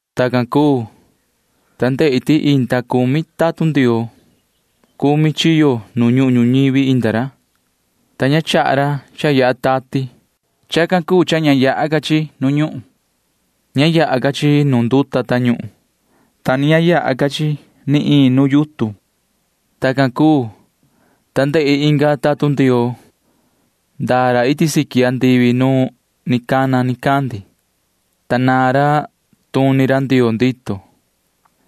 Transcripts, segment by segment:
Tacan cuu, ta ndehi ti inda cumi tatun Ndioo. Cumi chiyo nu ñuhun ñuñivi inda ra, ta ña chaha ra cha yaha tati. Chacan cuu cha ña yaha ca chi nu ñuhun. Ña yaha ca chi nu nduta tañuhun, ta ni ña yaha ca chi ni iin yutun. Tacan cuu, ta ndehi inga tatun Ndioo. Ndaa ra iti siqui andivi nu ni cana nicandi, ta naan ra tuni ra Ndioo ndito.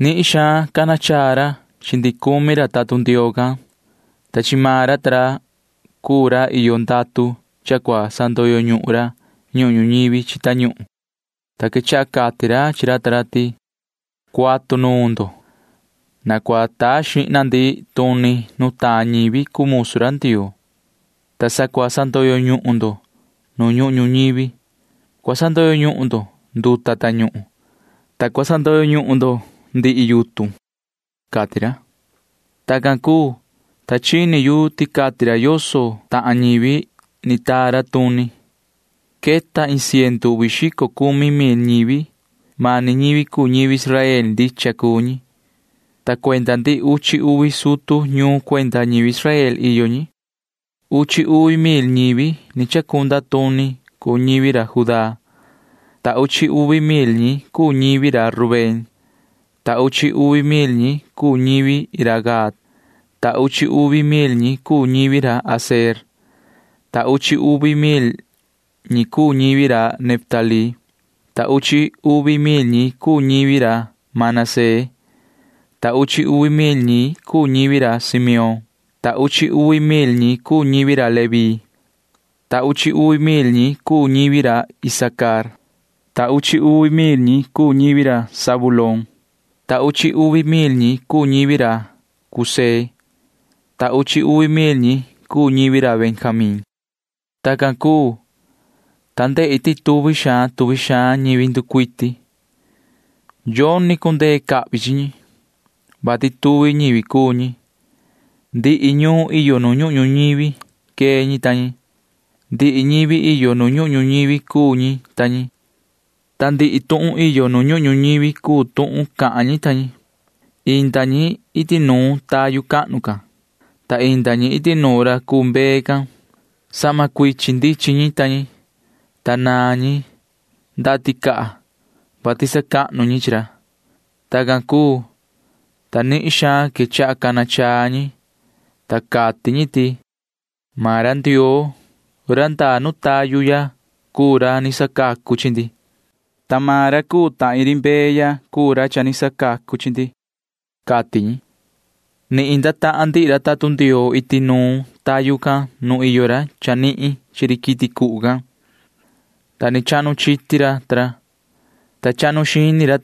Nihin suhva cana chaa ra chi ndihi cumi ra tatun Ndioo can, ta chi maan ra ta ra cuu ra iyo ndatu cha cua sandoyo ñuhun ra ñuhun ñuñivi chi tañuhun, ta quechaha cati ra chi ra ta ra ti: ―Cuatu nuun ndo. Na cua taa xihna ndi tuni nutaan ñivi cuu musu ra Ndioo, ta sa cua sandoyo ñuhun ndo nu ñuhun ñuñivi. Cua sandoyo ñuhun ndo nduta tañuhun, ta cua sandoyo ñuhun ndo yutun ―cati ra. Tacan cuu, ta chini yu ti cati ra yoso tahan ñivi ni taa ra tuni. Queta iin ciendu uvi xico cumi mil ñivi. Mani ñivi cuu ñivi Israel ndicha cuu ñi, ta cuenda ndihi uchi uvi sutu ñuun cuenda ñivi Israel iyo ñi. Uchi uvi mil ñivi ni chacunda tuni cuu ñivi ra Judá, ta uchi uvi mil ñi cuu ñivi ra Rubén, ta uchi uvi mil ñi cuu ñivi ra Gad, ta uchi uvi mil ñi cuu ñivi ra Aser, ta uchi uvi mil ñi cuu ñivi ra Neftalí, ta uchi uvi mil ñi cuu ñivi ra Manasee, ta uchi uvi mil ñi cuu ñivi ra Simeón, ta uchi uvi mil ñi cuu ñivi ra Leví, ta uchi uvi mil ñi cuu ñivi ra Isacar, ta uchi uvi mil ñi cuu ñivi ra Zabulón, ta uchi uvi mil ñi cuu ñivi ra José, ta uchi uvi mil ñi cuu ñivi ra Benjamín. Tacan cuu, ta ndehi ti tuvi xaan tuvi xaan ñivi nducuiti. Yoni cundee cahvi chi ñi, vati tuvi ñivi cuu ñi. Ndihi ñuun iyo nu ñuhun ñuñivi quee ñi ta ñi. Ndihi ñivi iyo nu ñuhun ñuñivi cuu ñi ta ñi, ta ndihi tuhun iyo nu ñuhun ñuñivi cuu tuhun cahan ñi ta ñi. Inda ñi iti nuun tayu cahnu can, ta inda ñi iti nuun ra cuu mbee can. Sahma cuichin ndichin ñi ta ñi, ta naan ñi ndaha ticaha, [vati sacahnu ñi chi ra]. Tacan cuu, ta nihin xaan quechaha cana chaa ñi, ta cati ñi ti: Maan ra Ndioo―ra ndaa nu tayu ya cuu ra ni sacacu chi ndi, ta maan ra cuu ta ri mbee ya cuu ra ni sacacu chi ndi, cati ñi. Ni inda tahan ndihi ra tatun Ndioo iti nu tayu can nu iyo ra chanihin chi ri quiti cuhu can, ta ni chahnu chiti ra, ta chahnu xini ra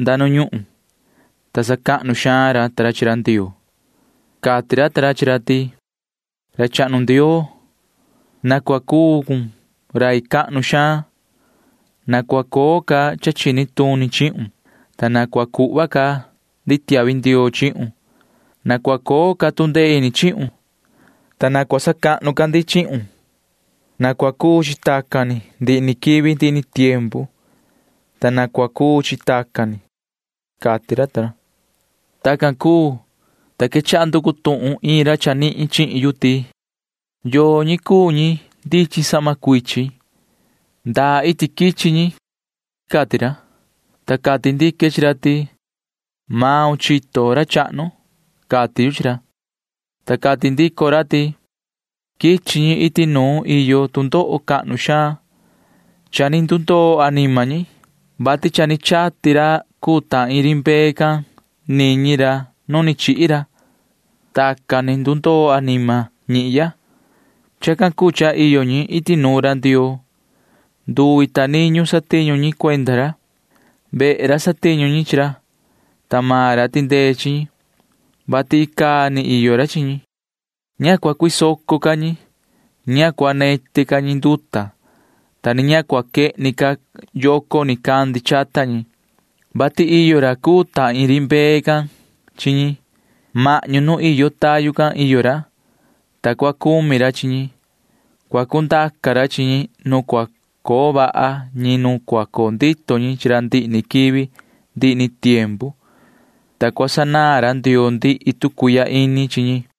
nda nu ñuhun, ta sacahnu xaan ra chi ra Ndioo. Cati ra ta ra chi ra ti: Yoho ra chahnu Ndioo, na cua cuu cun rai cahnu xaan. Na cua coo ca cha chini tuni chihun, ta na cua cuhva ca ndi tiahvi ndioo chihun. Na cua coo ca tu ndee ini chihun, ta na cua sacahnu ca ndi chihun. Na cua cuu chi tacan ni ndihi ni quivi ndihi ni tiempu, ta na cua cuu chi tacan ni, cati ra. Tacan cuu, ta quechaha nducu tuhun iin ra chanihin chihin yu ti: ―¿Yoo ñi cuu ñi ndichin sahma cuichin? ¿Ndaa iti quichi ñi? ―cati ra. Ta cati ndique chi ra ti: ―Yoho chito, ra chahnu ―cati yu chi ra. Ta cati ndico ra ti: ―Quichi ñi iti nu iyo tu ndoho cahnu xaan. Cha ni ndundoo anima ñi, vati cha ni chati ra cuu ta ri mbee can niñi ra nu ni chihi ra. Tacan ni ndundoo anima ñihya. Chacan cuu cha iyo ñi iti nuun ra Ndioo. Nduvi ta niñu satiñu ñi cuenda ra. Vehe ra satiñu ñi chi ra, ta maan ra tindee chi ñi, vati icaa ni iyo ra chi ñi. Ña cua cuisoco ca ñi. Ña cua neti ca ñi nduta, ta ni ña cua quehni ca yoco nicandi chata ñi, vati iyo ra cuu ta ri mbee can chi ñi. Mahñu nu iyo tayu can iyo ra, ta cua cumi ra chi ñi. Cua cundaca ra chi ñi nu cua coo vaha ñi nu cua coo ndito ñi chi ra ndihi ni quivi ndihi ni tiempu, ta cua sanaan ra Ndioo ndihi tu cuihya ini chi ñi ―cati ra.